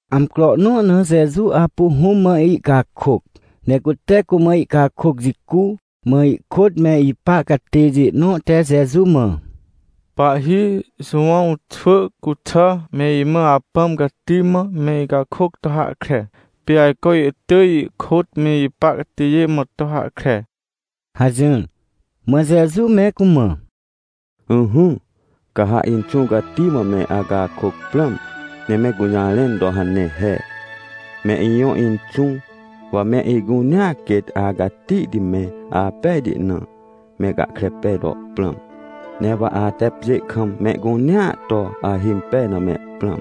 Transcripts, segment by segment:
Amcro nõ na Jeju apu Hũm mã ihcakôc, ne cute cumã ihcakôc jicu, mã ihkôt me ipa catêjê nõ te Jeju mã: ― Pahhi, Jowãw xwỳ cuxà me imã Apãm Cati mã me icakôc to hahkre. Pê ajco ihtỳj ihkôt me ipa catêjê mã to hahkre ― hajỹr. Mã Jeju me cumã: ― Ỹhỹ, ca ha Inxũ Cati mã me acakôc prãm, ne me gũjarẽn to hane he: “Me ijõ Inxũ, wa me icunea quêt acatihti ne apejti na, me gahkre pej to prãm. Ne wa ate pjê kam mehcunea to ahimpej na me prãm.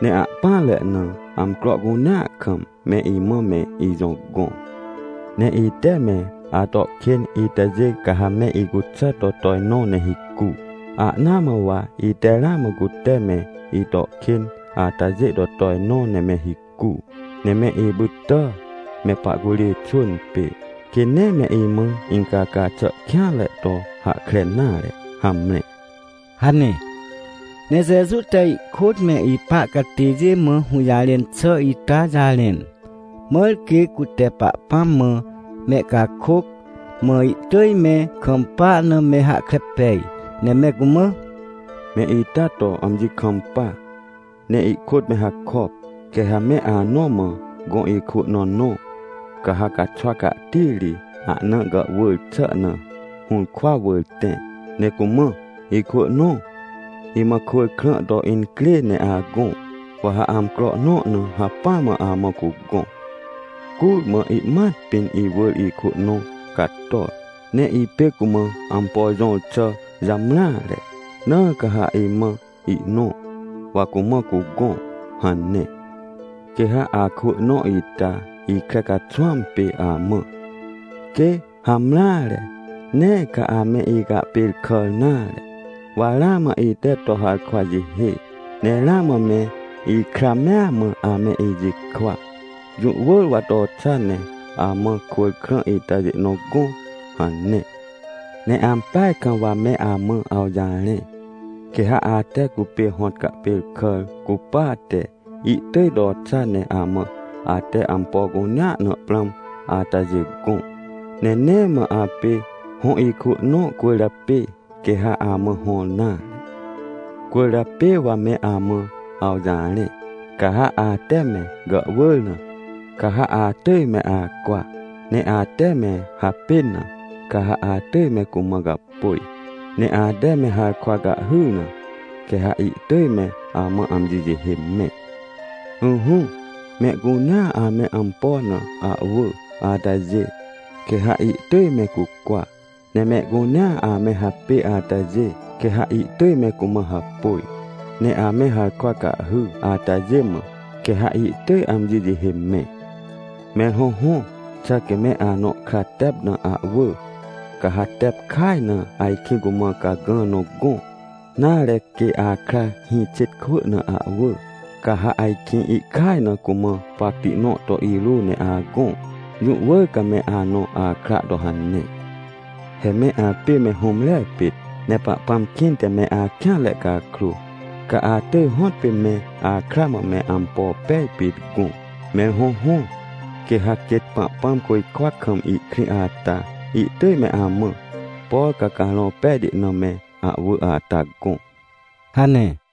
Ne ahpỹanre na, amcro cunea kam, me imã me ijõ gõ. Ne ite me ato kên itajê, ca ha me icuxà to tojnõ ne hicu, ahnaa mã wa ite ramã cute me ito kên atajê to tojnõ ne me hicu. Ne me ipytà me pahcurê xwỳn pê, quê nee me imã incaca xà kêanre to hahkre nare. Hamre” ― hane. Ne Jeju te ihkôt me ipa catêjê mã hũjarẽn xà ita jarẽn, mãr quê cute Pahpãm mã mehcakôc, mã ihtỳj me kampa na me hahkre pej, ne me cumã: ― Me ita to amji kampa, ne ihkôt me hakop. Quê ha me anõ mã gõ ikwỳ nõ nõ, ca ha caxwa cahtiri ahna gàhwỳr xà na hũrkwa wỳr tẽ, ne cumã: “Ikwỳ nõ, imã kwỳr krã to incrê ne agõ, wa ha amcro nõ na hacpỹa mã amã cugõ. Curmã ihmat pĩn, iwỳr ikwỳ nõ cator, ne ipê cumã ampo jõr xà jamreare, na ca ha imã ihnõ, wa cumã cugõ” hane. ― Quê ha akwỳ nõ ita ikre caxwãm pê amã: “Quê, hamreare, nee ca ame icahpêrkàr nare, wa ramã ite to harkwa jihê, ne ramã me ikra mea mã ame ijikwa, jũ wỳr wa to xa ne amã kwỳr krã itajê nõ gõ” hane. ― Ne ampeaj kam wa me amã awjarẽ, quê ha ate cupê hõt cahpêrkàr cupate, ihtỳj to xa ne amã ate ampo cunea na prãm atajê gõ. Ne nee mã apê hõ ikwỳ nõ cwỳrjapê quê ha amã hõr nare. ― Cwỳrjapê wa me amã awjarẽ, ca ha ate me gàhwỳr na, ca ha atỳj me acwa, ne ate me hapên na, ca ha atỳj me cumã gapôj, ne ate me harkwa cahhyr na, quê ha ihtỳj me amã amji jihê mẽ. ― Ỹhỹ, mehcunea ame ampo na ahwỳ atajê, quê ha ihtỳj me cucwa, ne mehcunea ame hapê atajê, quê ha ihtỳj me cumã hapôj, ne ame harkwa cahhy atajê mã, quê ha ihtỳj amji jihê mẽ. ― Mẽr hõhõ, xà quê me anõ kra tep na ahwỳ, ca ha tep kaj na ajkĩ cumã cagã nõ gõ? Nare quê akra hĩ xêt kwỳ na ahwỳ, ca ha ajkĩ ihkaj na cumã pacti nõ to irô ne agõ? Jũ wỳr ca me anõ akra to hane. He me apê me hũmre pit, ne Pahpãm kĩnte me akêanre cakrô, ca atỳj hõtpê me akra mã me ampo pej pit gõ. Mẽr hõhõ, quê ha quêt Pahpãm côjkwa kam ihkrĩ ata, ihtỳj me amã, por ca Carõ Pejti na me ahwỳ ata gõ ― hane.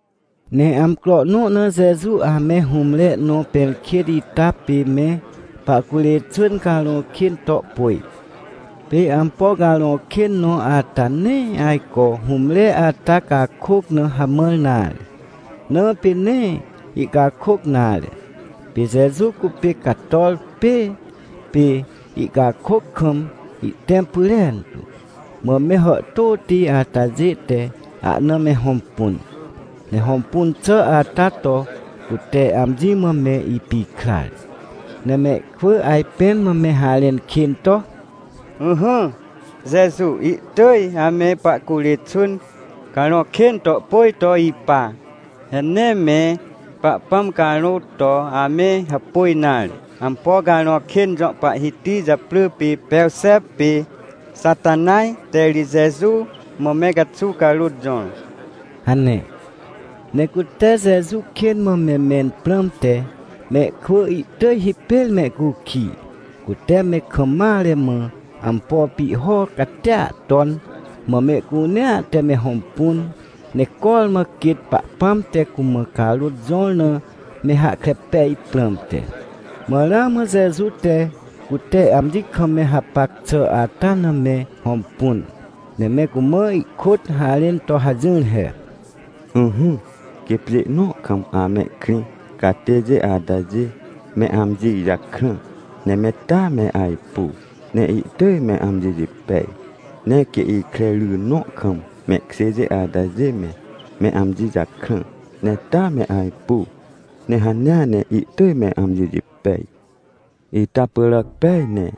Ne amcro nõ na Jeju ame hũmre nõ pẽrkêt ita pê me pahcurê xwỳn carõ kên to pôj. Pê ampo carõ kên nõ ata nee ajco hũmre ata cakôc na hamãr nare, na pê nee ihcakôc nare. Pê Jeju cupê cator pêê, pê ihcakôc kam ihtẽm pyrentu. Mã me hàhtôti atajê te ahna me hõmpun, ne hõmpun xà ata to cute amji mã me ipikrar. Ne mehkwỳ ajpẽn mã me harẽn kên to: ― Ỹhỹ, Jeju ihtỳj ame pahcurê xwỳn carõ kên to pôj to ipa. He nee me Pahpãm carôt to ame hapôj nare. Ampo carõ kên jõ pahhiti japrỳ pê Perxep pê Xatanaj te ri Jeju mã me caxuw carôt jõr ― hane. Ne cute Jeju kên mã me mẽn prãmte mehkwỳ ihtỳj hipêr mehcukij, cute me kam mare mã ampo pihho catia ton, mã mehcunea te me hõmpun, ne cormã quêt Pahpãm te cumã carôt jõr na me hahkre pej prãmte. Mã ramã Jeju te cute amji kam me hapac xà ata na me hõmpun, ne me cumã ihkôt harẽn to hajỹr he: ― Ỹhỹ, quê pjê nõ kam amehkrĩ catêjê atajê me amji jakrã, ne me taa me ajpu ne ihtỳj me amji jipej. Ne quê ikre ry nõ kam mehkjêjê atajê me, me amji jakrã, ne taa me ajpu, ne hanea ne ihtỳj me amji jipej. Ita pyràc pej ne,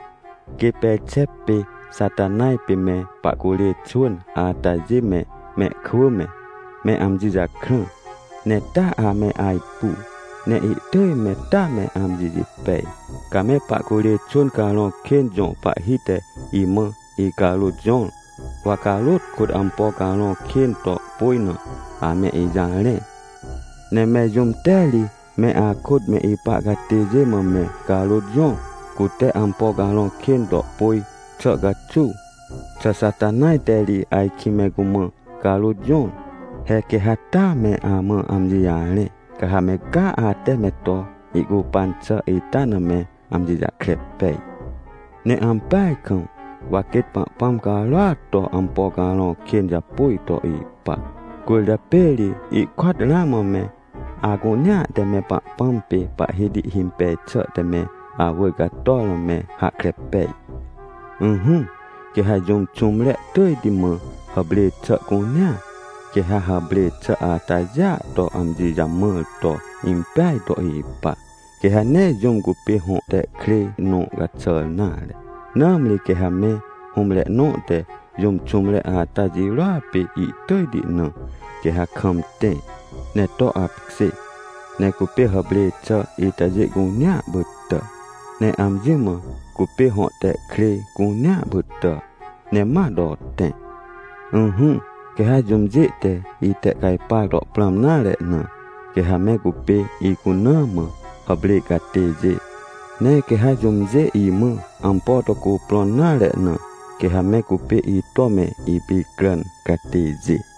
quê Perxep pê Xatanaj, pê me pahcurê xwỳn atajê me mehkwỳ me, me amji jakrã, ne taa ame ajpu, ne ihtỳj me taa me amji jipej. Ca me pahcurê xwỳn carõ kên jõ pahhi te imã icarôt jõr, wa carôt kôt ampo carõ kên to pôj na, ame ijarẽ. Ne mẽr jũm te ri me akôt me ipa catêjê mã me carôt jõr, cute ampo carõ kên to pôj xà caxuw? Xà Xatanaj te ri ajkĩ me cumã carôt jõr? He quê ha taa me amã amji jarẽ, ca ha me caa ate me to ihcupan xà ita na me amji jahkre pej. Ne ampeaj kam, wa quêt Pahpãm carôat to ampo carõ kên japôj to ipa, cwỳrjapê ri ihkôat ramã me acunea te me Pahpãm pê Pahhiti himpej xà te me awỳr cator na me hahkre pej. ― Ỹhỹ, quê ha jũm xũmre tỳjti mã hàprê xà cunea, quê ha hàprê xà atajêa to amji jamãr to impeaj to ipa, quê ha nee jũm cupê hõ tehkrêj nõ caxàr nare. Nãmri quê ha me hũmre nõ te jũm xũmre ata jirôa pê ihtỳjti na, quê ha kam tẽ, ne to apkjê, ne cupê hàprê xà itajê cunea pytà, ne amji mã cupê hõ tehkrêj cunea pytà, ne ma to tẽ. ― Ỹhỹ, quê ha jũmjê te itehcajpar to prãm nare na, quê ha me cupê icuna mã hàprê catêjê. Ne quê ha jũmjê imã ampo to cuprõn nare na, quê ha me cupê ito me ipicràn catêjê.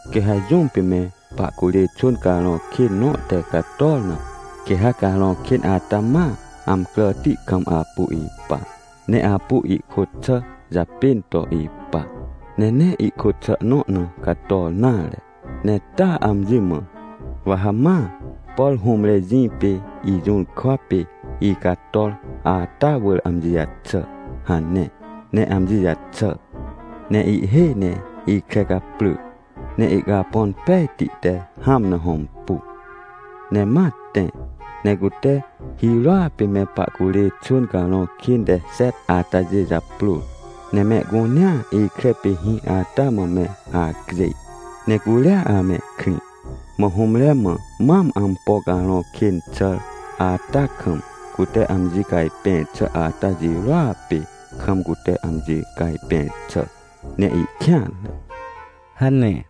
― Quê ha jũm pê me pahcurê xwỳn carõ kên nõ te cator na, quê ha carõ kên ata ma amcràti kam apu ipa, ne apu ihkôt xà japên to ipa. Ne nee ihkôt xà nõ na cator nare, ne taa amji mã: “Wa ha ma, por hũmre jĩ pê ijũrkwa pê icator ata wỳr amji jaxà” hane. Ne amji jaxà, ne ihhêj ne ikre caprỳ, ne ihcapõn pejti te hãm na hõmpu. Ne ma tẽ, ne cute hirôa pê me pahcurê xwỳn carõ kên te xet atajê japrôr, ne mehcunea ikre pê hĩ ata mã me acjêj, ne curia amehkrĩ. Mã hũmre mã mam ampo carõ kên xàr ata kam, cute amji cajpẽr xà ata jirôa pê kam cute amji cajpẽr xà, ne ihkêanre ― hane.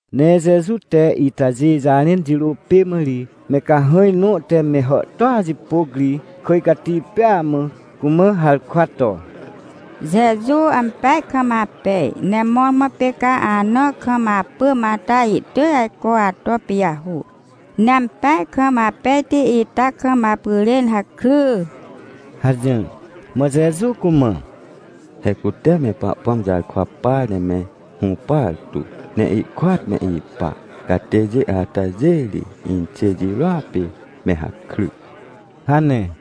Ne Jeju te itajê jarẽn jirô pê mã ri me cahãj nõ te me hàhtôa jipôc ri kỳj cati pêa mã, cumã harkwa to: ― Jeju ampeaj kam apej. Ne mõrmõ pê ca anã kam apỳm ata ihtỳj ajco ato pijahô, ne ampeaj kam apejti ita kam apyrên hakry ― hajỹr. Mã Jeju cumã: ― He cute me Pahpãm jarkwa par ne me hũpar tu, ne ihkôat me ipa catêjê atajê ri, inxê jirôa pê me hakry ― hane.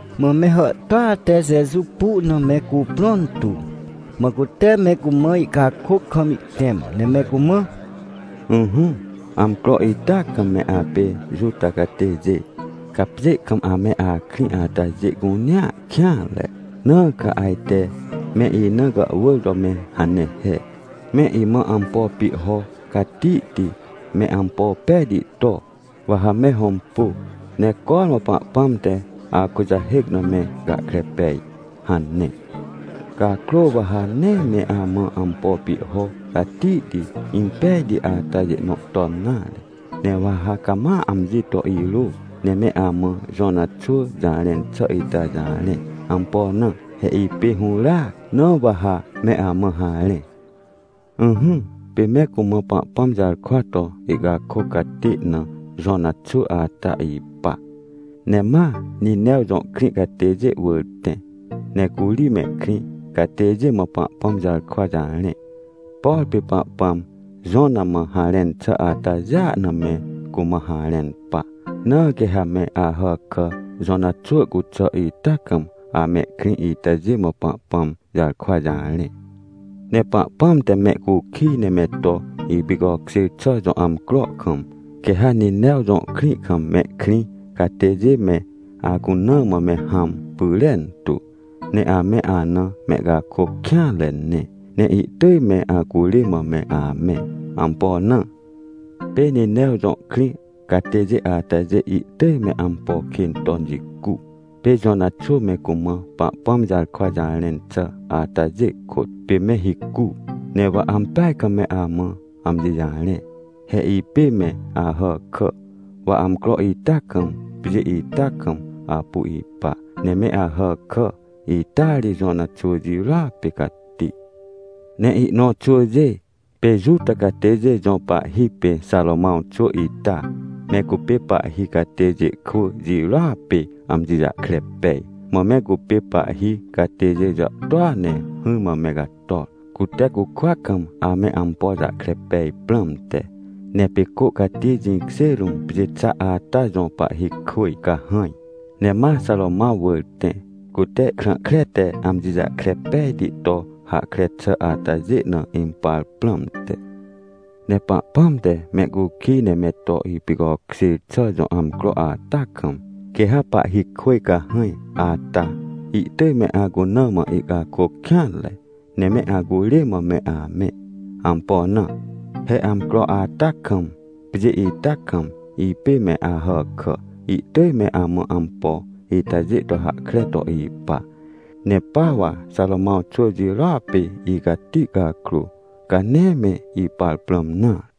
Mã me hàhtôa te Jeju pu na me cuprõn tu, mã cute me cumã ihcakôc kam ihtẽm, ne me cumã: ― Ỹhỹ, amcro ita kam me apê Juta catêjê, ca pjê kam ame akrĩ atajê cunea kêanre. Na ca ajte me ina gàhwỳr to me hane he: “Me imã ampo pihho catihti me ampo pejti to, wa ha me hõmpu, ne cormã Pahpãm te akujahêc na me gahkre pej” hane. Cakrô wa ha nee me amã ampo pihho catihti, impejti atajê nõ ton nare. Ne wa ha cama amji to irô, ne me amã Jona xwỳ jarẽn xà ita jarẽ. Ampo na? He ipê hũràac, na wa ha me amã harẽ. ― Ỹhỹ, pê me cumã Pahpãm jarkwa to ihcakôc catê na Jona xwỳ ata ipa, ne ma Ninew jõ krĩ catêjê wỳr tẽ. Ne curi mehkrĩ catêjê mã Pahpãm jarkwa jarẽ, por pê Pahpãm Jona mã harẽn xà atajêa na me cumã harẽn pa. Na quê ha me Ahàkà Jona xwỳ cuxà ita kam amehkrĩ itajê mã Pahpãm jarkwa jarẽ. Ne Pahpãm te mehcukij ne me to ipicokjêr xà jõ amcro kam, quê ha Ninew jõ krĩ kam mehkrĩ catêjê me acuna mã me hãm pyrentu, ne ame ana mehcakôc kêanre ne, ne ihtỳj me acurê mã me amẽ. Ampo na? Pê Ninew jõ krĩ catêjê atajê ihtỳj me ampo kên ton jicu, pê Jona xwỳ me cumã Pahpãm jarkwa jarẽn xà atajê kôt, pê me hicu. Ne wa ampeaj kam me amã amji jarẽ. He ipê me Ahàkà, wa amcro ita kam, pjê ita kam apu ipa, ne me Ahàkà ita ri Jona xwỳ jirôa pê cati. Ne ihnõ xwỳjê, pê Juta catêjê jõ pahhi pê Xarômãw xwỳ ita, me cupê pahhi catêjê kwỳ jirôa pê amji jahkre pej. Mã me cupê pahhi catêjê jàhtôa ne hỹrmã me cator, cute cukwa kam ame ampo jahkre pej prãmte. Ne pê cô cati jĩkjê rũm pjê xa ata jõ pahhikwỳj cahãj, ne ma Xarômãw wỳr tẽ, cute krã kre te amji jahkre pejti to hahkre xà atajê na impar prãmte. Ne Pahpãm te mehcukij ne me to ipicokjêr xà jõ amcro ata kam, quê ha pahhikwỳj cahãj ata, ihtỳj me acuna mã ihcakôc kêanre, ne me acurê mã me amẽ. Ampo na? He amcro ata kam, pjê ita kam, ipê me Ahàkà ihtỳj me amã ampo itajê to hahkre to ipa, ne pa wa Xarômãw xwỳ jirôa pê icati cakrô, ca nee me ipar prãm nare.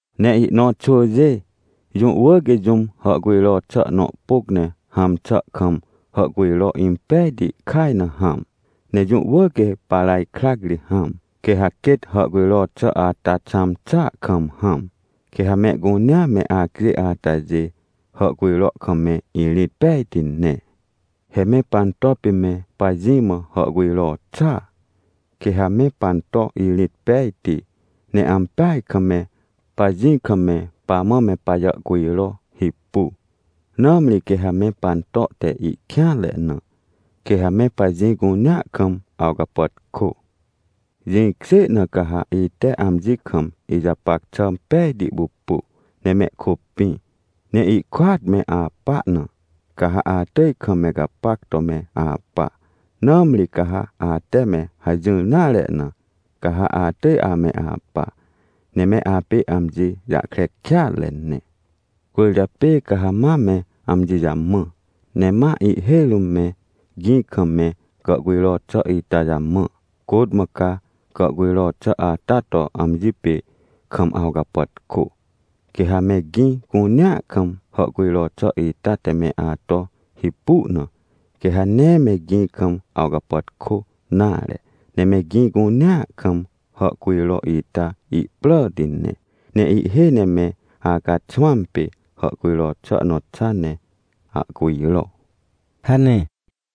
― Ne ihnõ xwỳjê, jũ wỳr quê jũm hàhcujro xà nõ pôc ne hãm xà kam hàhcujro impejti kaj na hãm, ne jũ wỳr quê paraj krac ri hãm. Quê ha quêt hàhcujro xà ata xãm xàa kam hãm, quê ha mehcunea me acjêj atajê hàhcujro kam me irĩt pejti ne. ― He me panto pê me pajĩ mã hàhcujro xàa. Quê ha me panto irĩt pejti, ne ampeaj kam me pajĩ kam me pamã me pajàhcujro hipu. Nãmri quê ha me panto te ihkêanre na, quê ha me pajĩ cunea kam awcapàtkô. Jĩkjê na ca ha ite amji kam ijapac xà pejti pupu, ne mehkôpĩ ne ihkôat me apa na, ca ha atỳj kam me gapac to me apa. Nãmri ca ha ate me hajỹr nare na, ca ha atỳj ame apa, ne me apê amji jahkre kêatre ne. ― Cwỳrjapê ca ha ma me amji jamã, ne ma ihhêj rũm me gĩ kam me gàhcujro xà ita jamã, côt mã ca gàhcujro xà ata to amji pê kam awcapàtkô. Quê ha me gĩ cunea kam hàhcujro xà ita te me ato hipu na, quê ha nee me gĩ kam awcapàtkô nare, ne me gĩ cunea kam hàhcujro ita ihpràti ne. Ne ihhêj ne me acaxwãm pê hàhcujro xà nõ xa ne ahcujro ― hane.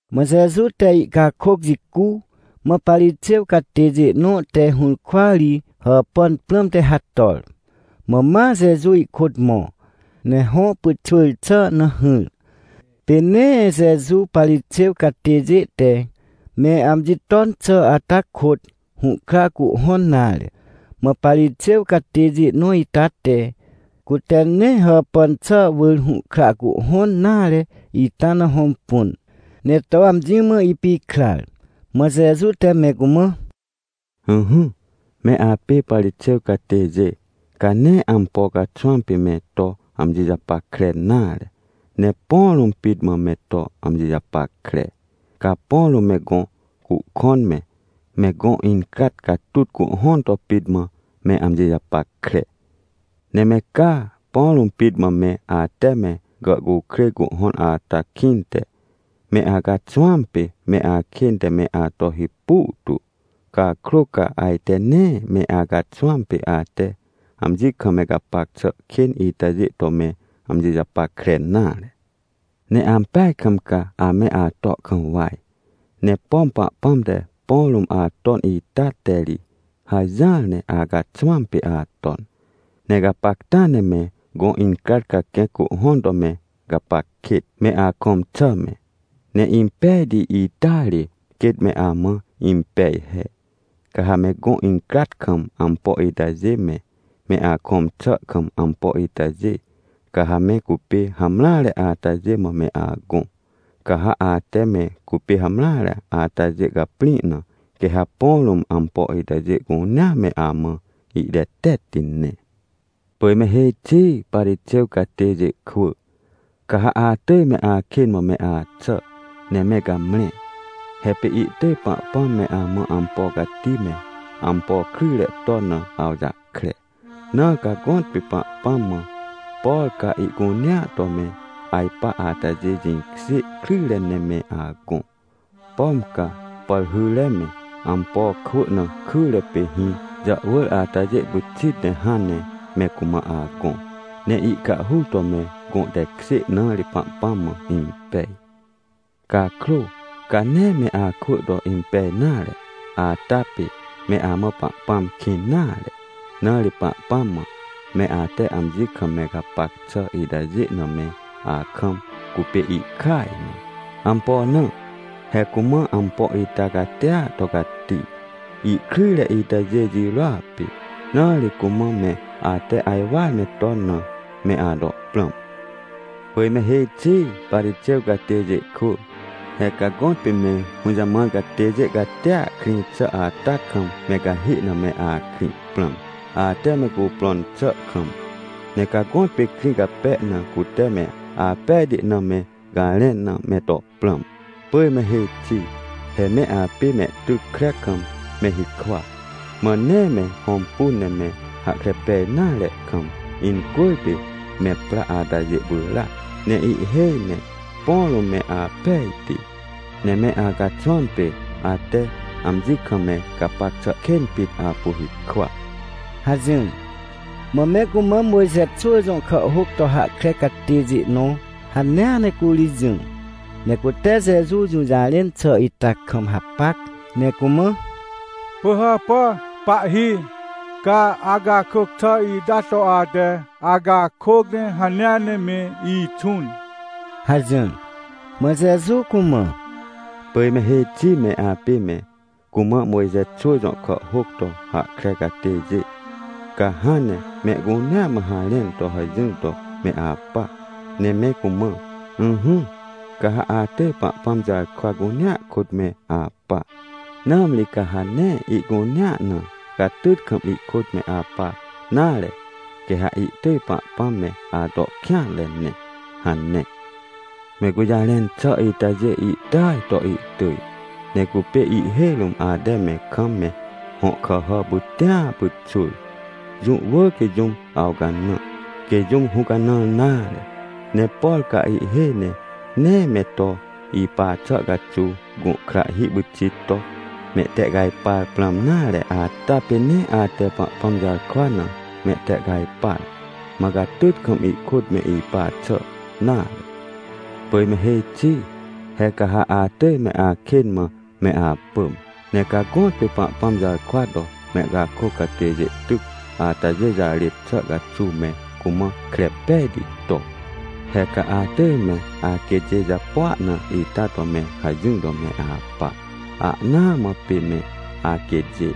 Mã Jeju te ihcakôc jicu, mã Parixêw catêjê nõ te hũrkwa ri hàpàn prãmte hator. Mã ma Jeju ihkôt mõ, ne hõ pyxwỳr xà na hỹr. Pê nee Jeju Parixêw catêjê te me amji ton xà ata kôt, hũhkra cuhhõn nare. Mã Parixêw catêjê nõ ita te, cute nee hàpàn xà wỳr hũhkra cuhhõn nare ita na hõmpun, ne to amji mã ipikrar. Mã Jeju te me cumã: ― Ỹhỹ, me apê Parixêw catêjê, ca nee ampo caxwãm pê me to amji japackre nare, ne põ rũm pit mã me to amji japackre. Ca põ rũm me gõ cuhkõn me, me gõ incrat catut cuhhõn to pit mã me amji japackre. Ne me caa, põ rũm pit mã me ate me gàhcukrêj cuhhõn ata kĩnte, me acaxwãm pê me akên te me ato hipu tu. Cakrô ca ajte nee me acaxwãm pê ate amji kam me gapac xà kên itajê to me amji japackre nare. ― Ne ampeaj kam ca ame ato kam waj, ne pom Pahpãm te põ rũm aton ita te ri hajỹar ne acaxwãm pê aton. Ne gapacta ne me gõ incrat caquẽc cuhhõn to me gapac kêt, me akõm xà me. Ne impejti ita ri quêt me amã impej he, ca ha me gõ incrat kam ampo itajê me, me akõm xà kam ampo itajê, ca ha me cupê hamreare atajê mã me agõ. Ca ha ate me cupê hamreare atajê caprĩ na, quê ha põ rũm ampo itajê cunea me amã ihtetetti ne. ― Pỳj me hêj xi Parixêw catêjê kwỳ! Ca ha atỳj me akên mã me axà ne me gamre! He pê ihtỳj Pahpãm me amã ampo cati me ampo kryjre ton na awjahkre. Na ca gõtpê Pahpãm mã, por ca ihcunea to me ajpa atajê jĩkjê kryjre ne me agõ. Pom ca pàrhyre me, ampo kwỳ na kyre pê hĩ jàhwỳr atajê pyxit ne hãn ne me cumã agõ, ne icahhur to me gõ tekjê na ri Pahpãm mã impej. Cakrô, ca nee me akwỳ to impej nare, ata pê me amã Pahpãm kĩn nare. Na ri Pahpãm mã, me ate amji kam me gapac xà itajê na me akam, cupê ihkaj na. Ampo na? He cumã ampo ita catia to cati, ihkryjre itajê jirôa pê. Na ri cumã me ate ajwar me ton na, me ato prãm. ― Pỳj me hêj xi Parixêw catêjê kwỳ! He ca gõtpê me hũjamãr catêjê catia krĩ xà ata kam me cahê na me akrĩ prãm, ate me cuprõn xà kam. Ne ca gõtpê krĩ cape na cute me apejti na me garẽn na me to prãm. ― Pỳj me hêj xi! He me apê mehtyc kre kam me hikwa, mã nee me hõmpun ne me hahkre pej nare kam, incwỳrpê me pra atajê pyràac. Ne ihhêj ne põ rũm me apejti, ne me acaxwãam pê ate amji kam me gapac xà kên pit apu hikwa ― hajỹr. Mã me cumã Mojxe xwỳ jõ kàhhôc to hahkre catêjê nõ hanea ne curi jỹ, ne cute Jeju jũjarẽn xà ita kam hapac, ne cumã: ― Pỳhàpà, Pahhi, ca acakôc xà ita to ate acakôc ne hanea ne me ixũn ― hajỹr. Mã Jeju cumã: ― Pỳj me hêj xi me apê me cumã Mojxe xwỳ jõ kàhhôc to hahkre catêjê! Ca hãn ne mehcunea mã harẽn to hajỹr to me apa ne me cumã: “Ỹhỹ, ca ha atỳj Pahpãm jarkwa cunea kôt me apa. Nãmri ca ha nee ihcunea na, catyt kam ihkôt me apa nare, quê ha ihtỳj Pahpãm me ato kêanre ne” hane. Me gũjarẽn xà itajê ihtỳaj to ihtỳj, ne cupê ihhêj rũm ate me kam me hõ kàhà pytĩa pyxwỳr. Jũ wỳr quê jũm awcanã, quê jũm hũcanãr nare. Ne por ca ihhêj ne nee me to ipa xà caxuw gũhkrahhi pyxit to mehtehcajpar prãm nare ata pê nee ate Pahpãm jarkwa na mehtehcajpar, mã catyt kam ihkôt me ipa xà nare. ― Pỳj me hêj xi! He ca ha atỳj me akên mã me apỳm! Ne ca gõtpê Pahpãm jarkwa to mehcakôc catêjê tyc atajê jarêt xà caxuw me cumã kre pejti to. He ca atỳj me aquêtjê japua na ita to me hajỹr to me apa, ahnaa mã pê me aquêtjê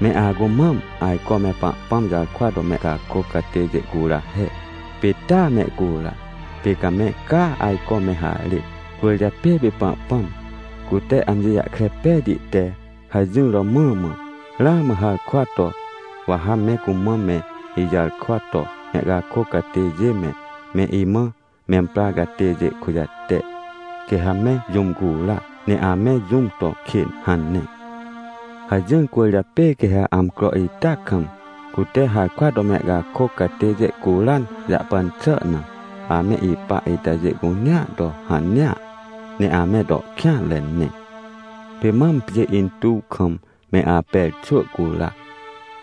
me acumam ajco me Pahpãm jarkwa to mehcakôc catêjê cura he. Pê taa mehcura, pê ca me caa ajco me harêt. ― Cwỳrjapê pê Pahpãm, cute amji jahkre pejti te hajỹr romã mã, ramã harkwa to: “Wa ha me cumã me ijarkwa to mehcakôc catêjê me, me imã memprar catêjê kujate. Quê ha me jũm cura, ne ame jũm to kên” hane. Hajỹr cwỳrjapê quê ha amcro ita kam, cute harkwa to mehcakôc catêjê curan jahpan xà na, ame ipa itajê cunea to hanea, ne ame to kêanre ne. Pê mam pjê intuw kam me Aper xwỳ cura,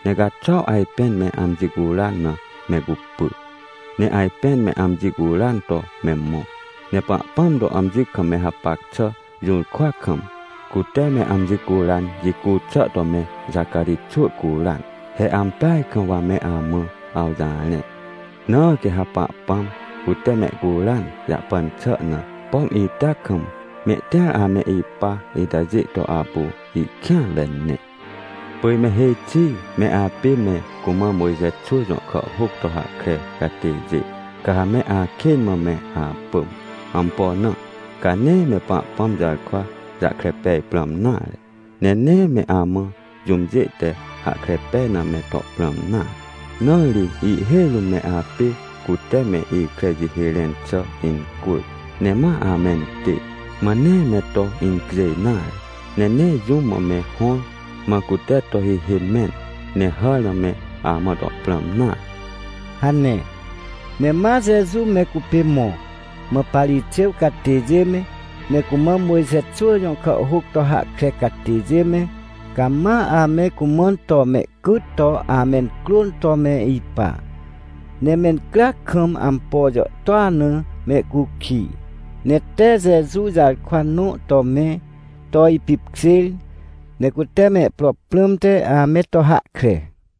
ne caxuaw ajpên me amji curan na me cupy, ne ajpên me amji curan to me mõ. Ne Pahpãm to amji kam me hapac xà jũrkwa kam, cute me amji curan jicu xà to me Xacarij xwỳ curan. He ampeaj kam wa me amã awjarẽ. Na quê ha Pahpãm, cute mehcuran jahpan xà na, pom ita kam mehtĩar ame ipa itajê to apu ihkêanre ne. ― Pỳj me hêj xi me apê me cumã Mojxe xwỳ jõ kàhhôc to hahkre catêjê! Ca ha me akên mã me apỳm! Ampo na? Ca nee me Pahpãm jarkwa jahkre pej prãm nare, ne nee me amã jũmjê te hahkre pej na me to prãm nare. Na ri ihhêj rũm me apê cute me ikre jihê rẽn xà incwỳr, ne ma amentê, mã nee me to incjêj nare, ne nee jũm mã me hõr, mã cute to hihê mẽn, ne hàr na me amã to prãm nare ― hane. Ne ma Jeju me cupê mõ, mã Parixêw catêjê me, me cumã Mojxe xwỳ jõ kàhhôc to hahkre catêjê me, cama ame cumãn to mehcyt to amencrôn to me ipa. Ne mencryac kam ampo jàhtôa na mehcukij. Ne tee Jeju jarkwa nõ to me to ipipkjêr, ne cute mehpro prãmte ame to hahkre.